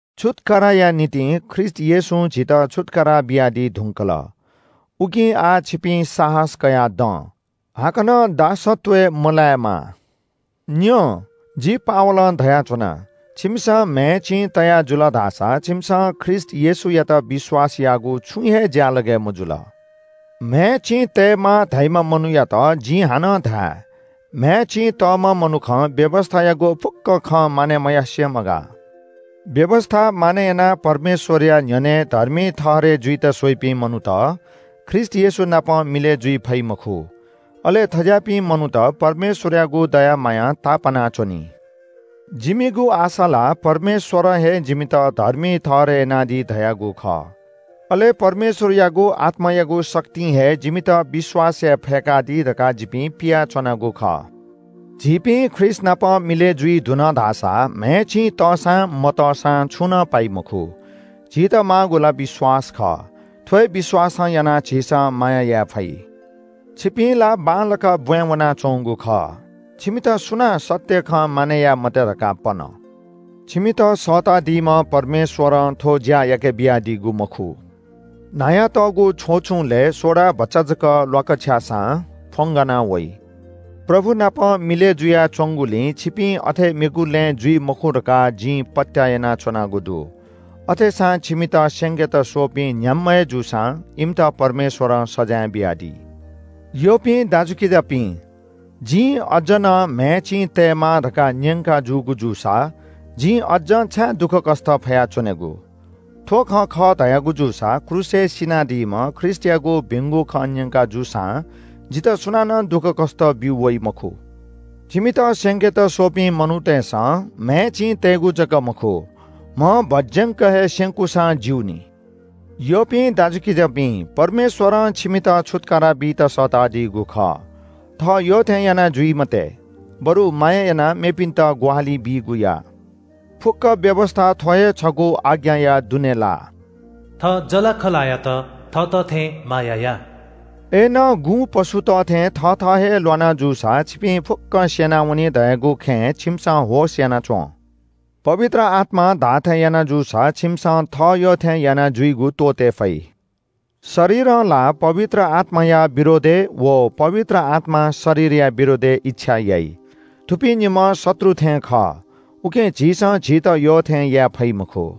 छुत्‍काराया निंतिं ख्रीष्‍ट येशूं झीत छुत्‍कारा बियादी धुंकल। उकिं आः छिपिं साहस कयाः दँ। हाकनं दासत्‍वय् मलायेमा। न्‍यँ, जि पावलं धयाच्‍वना – छिमिसं म्‍हय् चिं तया जुल धाःसा छिमिसं ख्रीष्‍ट येशूयात विश्‍वास याःगु छुं हे ज्‍यालगय् मजुल। म्‍हय् चिं तयेमाः धाइम्‍ह मनूयात जिं हानं धाये – म्‍हय् चिं तःम्‍ह मनुखं व्‍यवस्‍थायागु फुक्‍क खँ मानय् मयासें मगाः। व्‍यवस्‍था मानय् यानाः परमेश्‍वरया न्‍ह्यःने धर्मी ठहरय् जुइत स्‍वइपिं मनूत ख्रीष्‍ट येशू नाप मिलय् जुइ फइ मखु। अले थज्‍याःपिं मनूत परमेश्‍वरयागु दया मायां तापाना च्‍वनी। जिमिगु आशा ला परमेश्‍वरं हे जिमित धर्मी ठहरय् यानादी धयागु खः। अले परमेश्‍वरयागु आत्‍मायागु शक्तिं हे जिमित विश्‍वास याये फय्‌कादी धकाः जिपिं पियाच्‍वनागु खः। झीपिं ख्रीष्‍टनाप मिलय् जुइ धुन धाःसा म्‍हय् चिं तःसां मतःसां छुं नं पाइ मखु। झीत माःगु ला विश्‍वास खः। थ्‍व हे विश्‍वासं यानाः झीसं माया याये फइ। छिपिं ला बांलाक ब्‍वाँय् वनाच्‍वंगु खः। छिमित सुनां सत्‍य खँ मानय् याये मते धकाः पन? छिमित सःतादीम्‍ह परमेश्‍वरं थ्‍व ज्‍या याके बियादीगु मखु। “न्‍हायातःगु छ्वचुंलय् सोडा भचा जक ल्‍वाकछ्याःसां फ्‍वंगाना वइ।” प्रभु नाप मिलय् जुयाच्‍वंगुलिं छिपिं अथे मेगु लँय् जुइ मखु धकाः जिं पत्‍याः यानाच्‍वनागु दु। अथेसां छिमित स्‍यंकेत स्‍वःपिं, न्‍ह्याम्‍ह हे जूसां, इमित परमेश्‍वरं सजाँय बियादी। यःपिं दाजुकिजापिं, जिं अज्‍ज नं म्‍हय् चिं तयेमाः धकाः न्‍यंकाजूगु जूसा जिं अज्‍जं छाय् दुःखकष्‍ट फया च्‍वनेगु? थ्‍व खँ खः धयागु जूसा क्रूसय् सिनादीम्‍ह ख्रीष्‍टयागु भिंगु खँ न्‍यंका जूसां जितः सुनानं दुःखकष्‍ट ब्‍यू वइ मखु। छिमित स्‍यंकेत स्‍वःपिं मनूतय्‌सं म्‍हय् चिं तयेगु जक मखु म्‍ह भज्‍यंक हे स्‍यंकूसां ज्‍यू नि। यःपिं दाजुकिजापिं, परमेश्‍वरं छिमित छुत्‍कारा बीत सःतादीगु खः। थः यःथें याना जुइ मते, बरु माया यानाः मेपिन्‍त ग्‍वाहालि बीगु या। फुक्‍क व्‍यवस्‍था थ्‍व हे छगू आज्ञाया दुने लाः – “थः जःलाखःलायात थःत थें माया या।” अय्‌नं गुँपशुत थें थथः हे ल्‍वाना जूसा छिपिं फुक्‍कं स्‍यनावनी धयागु खँय् छिमिसं होश‍ यानाच्‍वँ। पवित्र आत्‍मां धाःथें याना जूसा छिमिसं थः यःथें यानाजुइगु त्‍वःते फइ। शरीरं ला पवित्र आत्‍माया विरोधय् व पवित्र आत्‍मां शरीरया विरोधय् इच्‍छा याइ। थुपिं निम्‍ह शत्रु थें खः, उकिं झीसं झीत यःथें याये फइ मखु।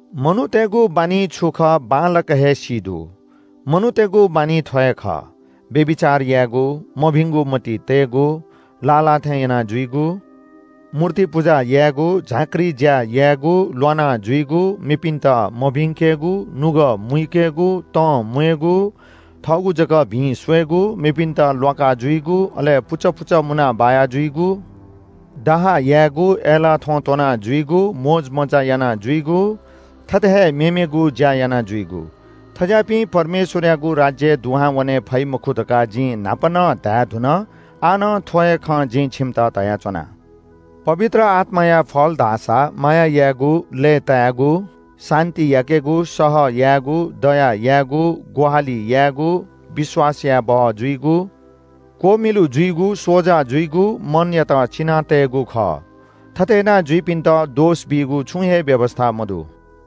मनूतय्‌गु बानी छु खः बांलाक हे सी दु। मनूतय्‌गु बानी थ्‍व हे खः – व्‍यभिचार यायेगु, मभिंगु मतिइ तयेगु, लाः लाः थें यानाजुइगु, मूर्ति पुजा यायेगु, झाँक्री ज्‍या यायेगु, ल्‍वाना जुइगु, मेपिन्‍त मभिंकेगु, नुगः मुइकेगु, तंम्‍वयेगु, थःगु जक भिं स्‍वयेगु, मेपिन्‍त ल्‍वाका जुइगु, अले पुचः पुचः मुनाः बाया जुइगु, डाहा यायेगु, अय्‌लाः थ्‍वँ त्‍वना जुइगु, मोजमज्‍जा यानाजुइगु, थथे हे मेमेगु ज्‍या यानाजुइगु। थज्‍याःपिं परमेश्‍वरयागु राज्‍यय् दुहां वने फइ मखु धकाः जिं न्‍हापा नं धायेधुन, आः नं थ्‍व हे खँ जिं छिमित धयाच्‍वना। पवित्र आत्‍माया फल धाःसा माया यायेगु, लय्‌तायेगु, शान्‍ति याकेगु, सह यायेगु, दया यायेगु, ग्‍वाहालि यायेगु, विश्‍वास यायेबहः जुइगु, नम्र जुइगु, स्‍वजा जुइगु, मनयात चिना तयेगु खः। थथे यानाजुइपिन्‍त दोष बीगु छुं हे व्‍यवस्‍था मदु।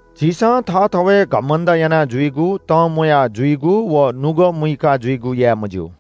झीसं थःथवय् घमण्‍ड यानाजुइगु, तंम्‍वया जुइगु व नुगः मुइका जुइगु याये मज्‍यू।